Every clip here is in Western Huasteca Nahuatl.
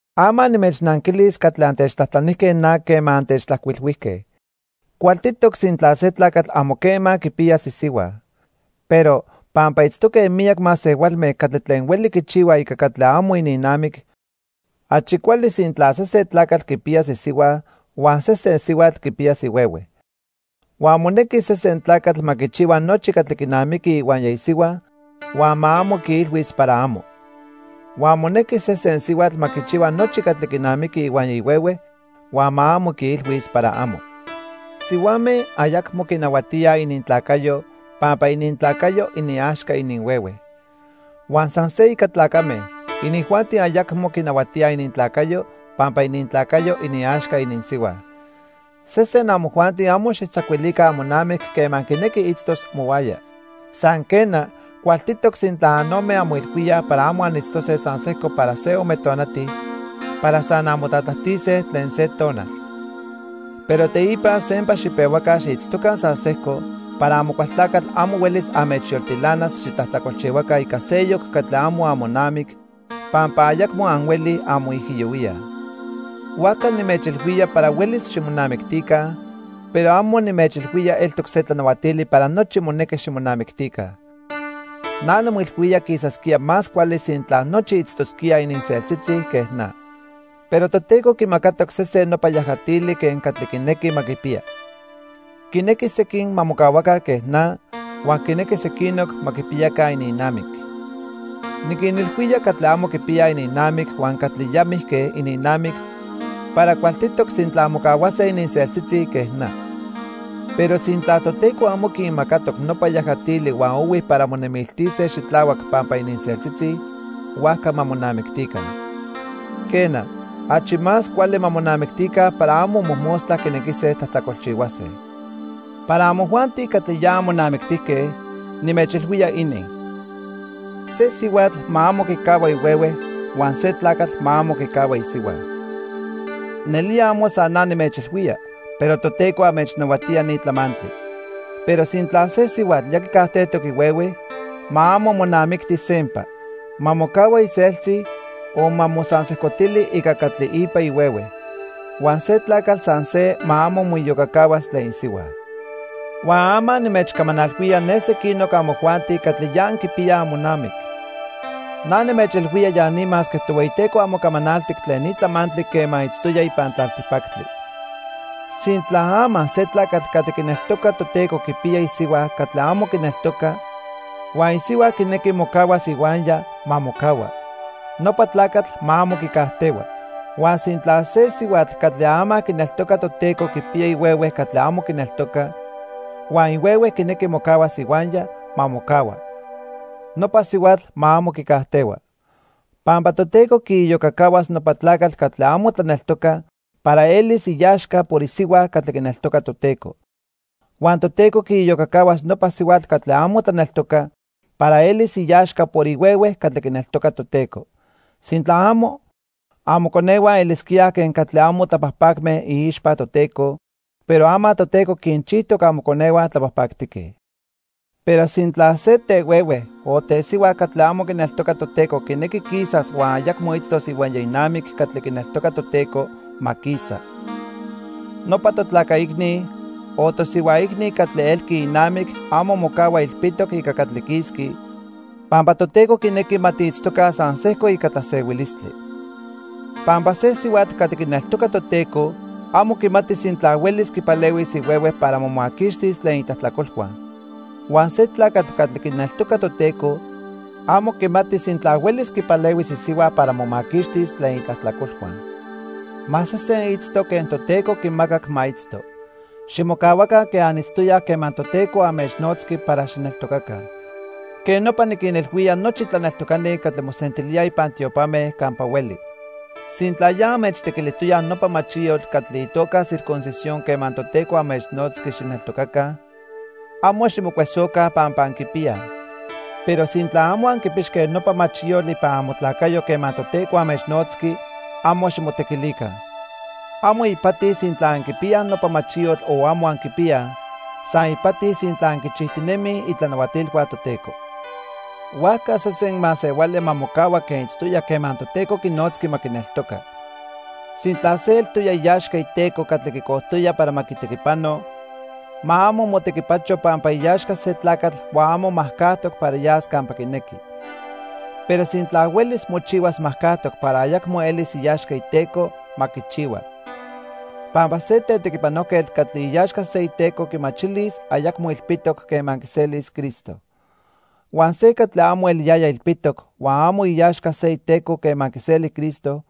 Ama nimechnanquilis catli antechtlajtlanijque na quema antechtlajcuilhuijque. Cualtitoc sintla se tlacatl amo quema quipiyas isihua. Pero, pampa itztoque miyac masehualme catli tlen hueli quichihuaj ica catli amo ininnamic, achi cuali sintla sesen tlacatl quipiyas isihua, huan sesen sihuatl quipiyas ihuehue. Huan monequi sesen tlacatl ma quichihua nochi catli quinamiqui ihuaya isihua huan ma amo quiilhuis para amo. Huan monequi sesen sihuatl ma quichihua nochi catli quinamiqui ihuaya ihuehue huan ma amo quiilhuis para amo. Sihuame ayacmo quinahuatíaj inintlacayo pampa inintlacayo iniaxca ininhuehue. Huan san se ica tlacame, inijuanti ayacmo quinahuatíaj inintlacayo pampa inintlacayo iniaxca ininsihua. Sesen amojuanti amo xijtzacuilica amonamic quema quinequi itztos mohuaya. San quena, cualtitoc sintla anome anmoilhuíaj para amo anitztose san sejco para se ome tonati para san anmotlatlajtise tlen se tonal. Pero teipa sempa xipehuaca xiitztoca san sejco para Amocualtlacatl amo huelis anmechyoltilanas xitlajtlacolchihuaca ica seyoc catli amo amonamic pampa ayacmo anhuelij anmoijiyohuíaj. Huajca nimechilhuía para huelis ximonamictica, pero amo nimechilhuía eltoc se tlanahuatili para nochi monequi ximonamictica. Na nimoilhuía quisasquía más cuali sintla nochi itztosquíaj ininseltzitzi quen na. Pero Toteco quimacatoc sesen nopa yajatili quen catli quinequi ma quipiya. Quinequi sequin ma mocahuaca quen na, huan quinequi sequinoc ma quipiyaca ininnamic. Niquinilhuía catli amo quipiyaj ininnamic huan catli ya mijque ininnamic para cualtitoc sintla mocahuase ininseltzitzi quen na. Pero sintla Toteco amo quinmacatoc nopa yajatili huan ohui para monemiltise xitlahuac pampa ininseltzitzi, huajca ma monamictica. Quena, achi más cuali ma monamictica para amo mojmostla quinequise tlajtlacolchihuase. Para amojuanti catli ya anmonamictijque, nimechilhuía inin. Se sihuatl ma amo quicahua ihuehue huan se tlacatl ma amo quicahua isihua. Nelía amo san na nimechilhuía, pero Toteco anmechnahuatía ni tlamantli. Pero sintla se sihuatl ya quicajtejtoc ihuehue, ma amo monamicti sempa. Ma mocahua iseltzi o ma mosansejcotili ica catli ipa ihuehue. Huan se tlacatl san se ma amo moiyocacahuas tlen isihua. Huan ama nimechcamanalhuía ne sequinoc amojuanti catli ya anquipiyaj amonamic. Na nimechilhuía ya ni masque Tohueyiteco amo camanaltic tlen ni tlamantli quema itztoya ipan tlaltipactli. Sintla ama se tlacatl catli quineltoca Toteco quipiya isihua catli amo quineltoca huan isihua quinequi mocahuas ihuaya, ma mocahua. Nopa tlacatl ma amo quicajtehua. Huan sintla se sihuatl catli ama quineltoca Toteco quipiya ihuehue catli amo quineltoca huan ihuehue quinequi mocahuas ihuaya, ma mocahua. Nopa sihuatl ma amo quicajtehua. Pampa Toteco quiiyocacahuas nopa tlacatl catli amo tlaneltoca para elis iaxca por isihua catli quineltoca Toteco. Huan Toteco quiiyocacahuas nopa sihuatl catli amo tlaneltoca para elis iaxca por ihuehue catli quineltoca Toteco. Sintla amo, amoconehua elisquíaj quen catli amo tlapajpacme iixpa Toteco, pero ama Toteco quinchijtoc amoconehua tlapajpactique. Pero sintla se tehuehue o tesihua catli amo quineltoca Toteco quinequi quisas huan ayacmo itztos ihuaya inamic catli quineltoca Toteco, ma quisa. Nopa totlaca icni o tosihua icni catli elqui inamic amo mocahua ilpitoc ica catli quisqui, pampa Toteco quinequi ma tiitztoca san sejco ica tlasehuilistli. Pampa se sihuatl catli quineltoca Toteco, amo quimati sintla huelis quipalehuis ihuehue para momaquixtis tlen itlajtlacolhua. Huan se tlacatl catli quineltoca Toteco, amo quimati sintla huelis quipalehuis isihua para momaquixtis tlen itlajtlacolhua. Ma sesen itzto quen Toteco quimacac ma itzto. Ximocahuaca quen anitztoyaj quema Toteco anmechnotzqui para xijneltocaca. Quej nopa niquinilhuía nochi tlaneltocani catli mosentilíaj ipan tiopame campa hueli. Sintla ya anmechtequilijtoyaj nopa machiyotl catli itoca circuncisión quema Toteco anmechnotzqui xijneltocaca, amo ximocuesoca pampa anquipiyaj. Pero sintla amo anquipixque nopa machiyotl ipan amotlacayo quema Toteco anmechnotzqui, amo ximotequilica. Amo ipati sintla anquipiyaj nopa machiyotl o amo anquipiyaj, san ipati sintla anquinchijtinemij itlanahuatilhua Toteco. Huajca sesen masehuali ma mocahua quen itztoya quema Toteco quinotzqui ma quineltoca. Sintla se eltoya iaxca iteco catli quicojtoya para ma quitequipano, ma amo motequipacho pampa iaxca se tlacatl huan amo majcajtoc para yas campa quinequi. Pero sintla huelis mochihuas majcajtoc para ayacmo elis iaxca iteco, ma quichihua. Pampa se tetequipanojquetl catli iaxca se iteco quimachilis ayacmo ilpitoc quema quiselis Cristo. Huan se catli amo eliyaya ilpitoc huan amo iaxca se iteco quema quiseli Cristo,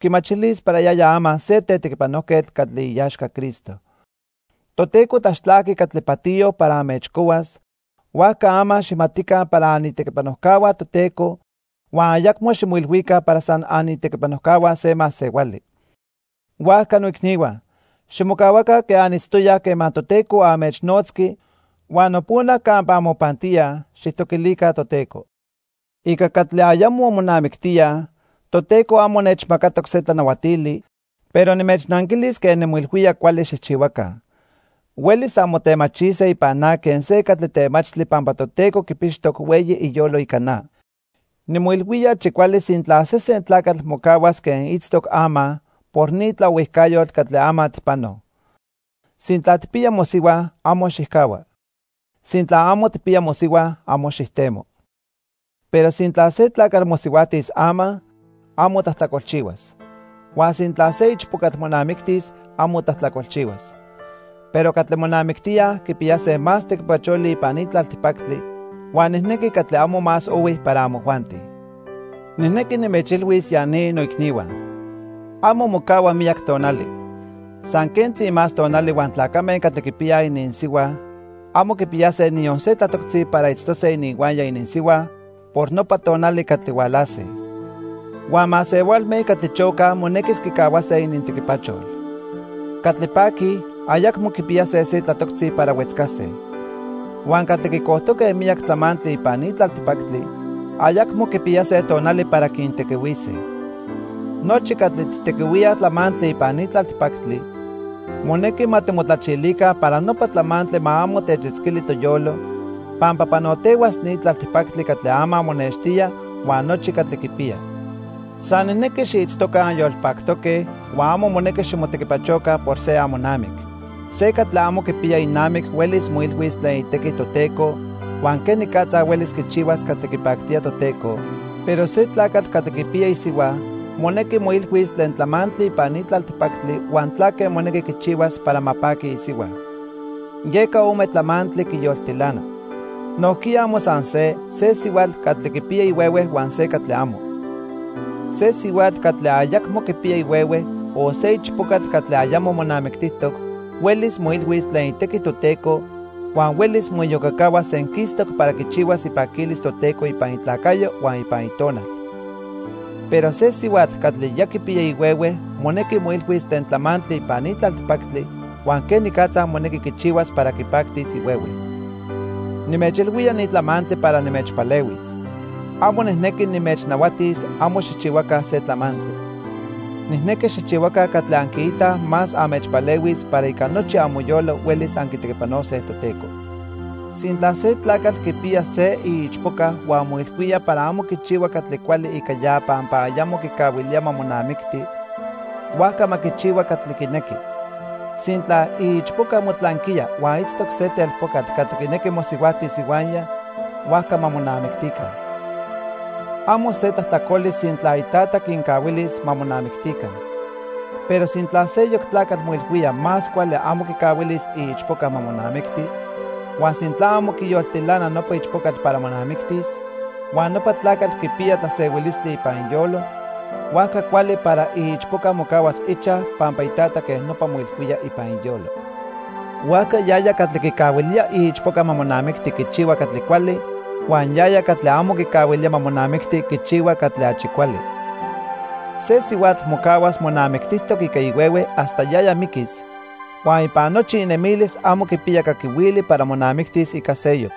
quimachilis para yaya ama se tetequipanojquetl catli iaxca Cristo. Toteco tlaxtlajqui catli patiyo para anmechcohuas, huajca ama xijmatica para anitequipanojcahua Toteco huan ayacmo ximoilhuica para san anitequipanojcahua se masehuali. Huajca noicnihua, ximocahuaca quen anitztoyaj quema Toteco anmechnotzqui huan nopona campa anmopantíaj, xijtoquilica Toteco. Ica catli ayamo monamictíaj, Toteco amo nechmacatoc se tlanahuatili, pero nimechnanquilis quen nimoilhuía cuali xijchihuaca. Huelis anmotemachise ipan na quen se catli temachtli pampa Toteco quipixtoc hueyi iyolo ica na. Nimoilhuía achi cuali sintla sesen tlacatl mocahuas quen itztoc ama por ni tlaohuijcayotl catli ama tijpanoj. Sintla tijpiya mosihua, amo xijcahua. Sintla amo tijpiya mosihua, amo xijtemo. Pero sintla se tlacatl mosihuajtis ama, amo tlajtlacolchihuas. Huan sintla se ichpocatl monamictis, amo tlajtlacolchihuas. Pero catli monamictíaj quipiyase más tequipacholi ipan ni tlaltipactli huan nijnequi catli amo más ohui para amojuanti. Nijnequi nimechilhuis ya ni, noicnihua. Amo mocahua miyac tonali. San quentzi más tonali huan tlacame catli quipiyaj ininsihua amo quipiyase niyon se tlatoctzi para itztose ininhuaya ininsihua por nopa tonali catli hualase. Huan masehualme catli chocaj monequis quicahuase inintequipachol. Catli paquij, ayacmo quipiyase se tlatoctzi para huetzcase. Huan catli quicojtoque miyac tlamantli ipan ni tlaltipactli, ayacmo quipiyase tonali para quintequihuise. Nochi catli tijtequihuíaj tlamantli ipan ni tlaltipactli, monequi ma timotlachilica para nopa tlamantli ma amo techitzquili toyolo, pampa panotehuas ni tlaltipactli catli ama monextía huan nochi catli quipiya. San nijnequi xiitztoca anyolpactoque huan amo monequi ximotequipachoca por se amonamic. Se catli amo quipiya inamic huelis moilhuis tlen itequi Toteco huan quenicatza huelis quichihuas catli quipactía Toteco, pero se tlacatl catli quipiya isihua, monequi moilhuis tlen tlamantli ipan ni tlaltipactli huan tlaque monequi quichihuas para ma paqui isihua. Yeca ome tlamantli quiyoltilana. Nojquiya amo san se, se sihuatl catli quipiya ihuehue huan se catli amo. Se sihuatl catli ayacmo quipiya ihuehue o se ichpocatl catli ayamo monamictijtoc huelis moilhuis tlen itequi Toteco huan huelis moiyocacahuas senquistoc para quichihuas ipaquilis Toteco ipan itlacayo huan ipan itonal. Pero se sihuatl catli ya quipiya ihuehue monequi moilhuis tlen tlamantli ipan ni tlaltipactli huan quenicatza monequi quichihuas para quipactis ihuehue. Nimechilhuía ni tlamantli para nimechpalehuis. Amo nijnequi nimechnahuatis amo xijchihuaca se tlamantli. Nijnequi xijchihuaca catli anquiitaj más anmechpalehuis para ica nochi amoyolo huelis anquitequipanose Toteco. Sintla se tlacatl quipiya se iichpoca huan moilhuía para amo quichihua catli cuali ica ya pampa ayamo quicahuilía ma monamicti, huajca ma quichihua catli quinequi. Sintla iichpoca motlanquiya huan itztoc se telpocatl catli quinequi mosihuajtis ihuaya, huajca ma monamictica. Amo se tlajtlacoli sintla itata quincahuilis ma monamictica. Pero sintla seyoc tlacatl moilhuía más cuali amo quicahuilis iichpoca ma monamicti, huan sintla amo quiyoltilana nopa ichpocatl para monamictis, huan nopa tlacatl quipiya tlasehuilistli ipan iyolo, huajca cuali para iichpoca mocahuas ichaj pampa itata quej nopa moilhuía ipan iyolo. Huajca yaya catli quicahuilía iichpoca ma monamicti quichihua catli cuali, huan yaya catli amo quicahuilía ma monamicti quichihua catli achi cuali. Se sihuatl mocahuas monamictijtoc ica ihuehue hasta yaya miquis huan ipan nochi inemilis amo quipiya caquihuili para monamictis ica seyoc.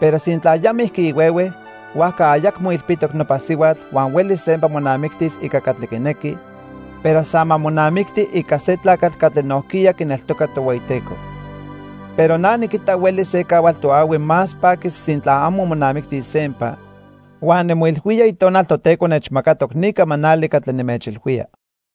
Pero sintla ya mijqui ihuehue, huajca ayacmo ilpitoc nopa sihuatl huan huelis sempa monamictis ica catli quinequi, pero san ma monamicti ica se tlacatl catli nojquiya quineltoca Tohueyiteco. Pero na niquita huelis se cahual toahui más paquis sintla amo monamictis sempa, huan nimoilhuía Itonal Toteco nechmacatoc ni camanali catli nimechilhuía.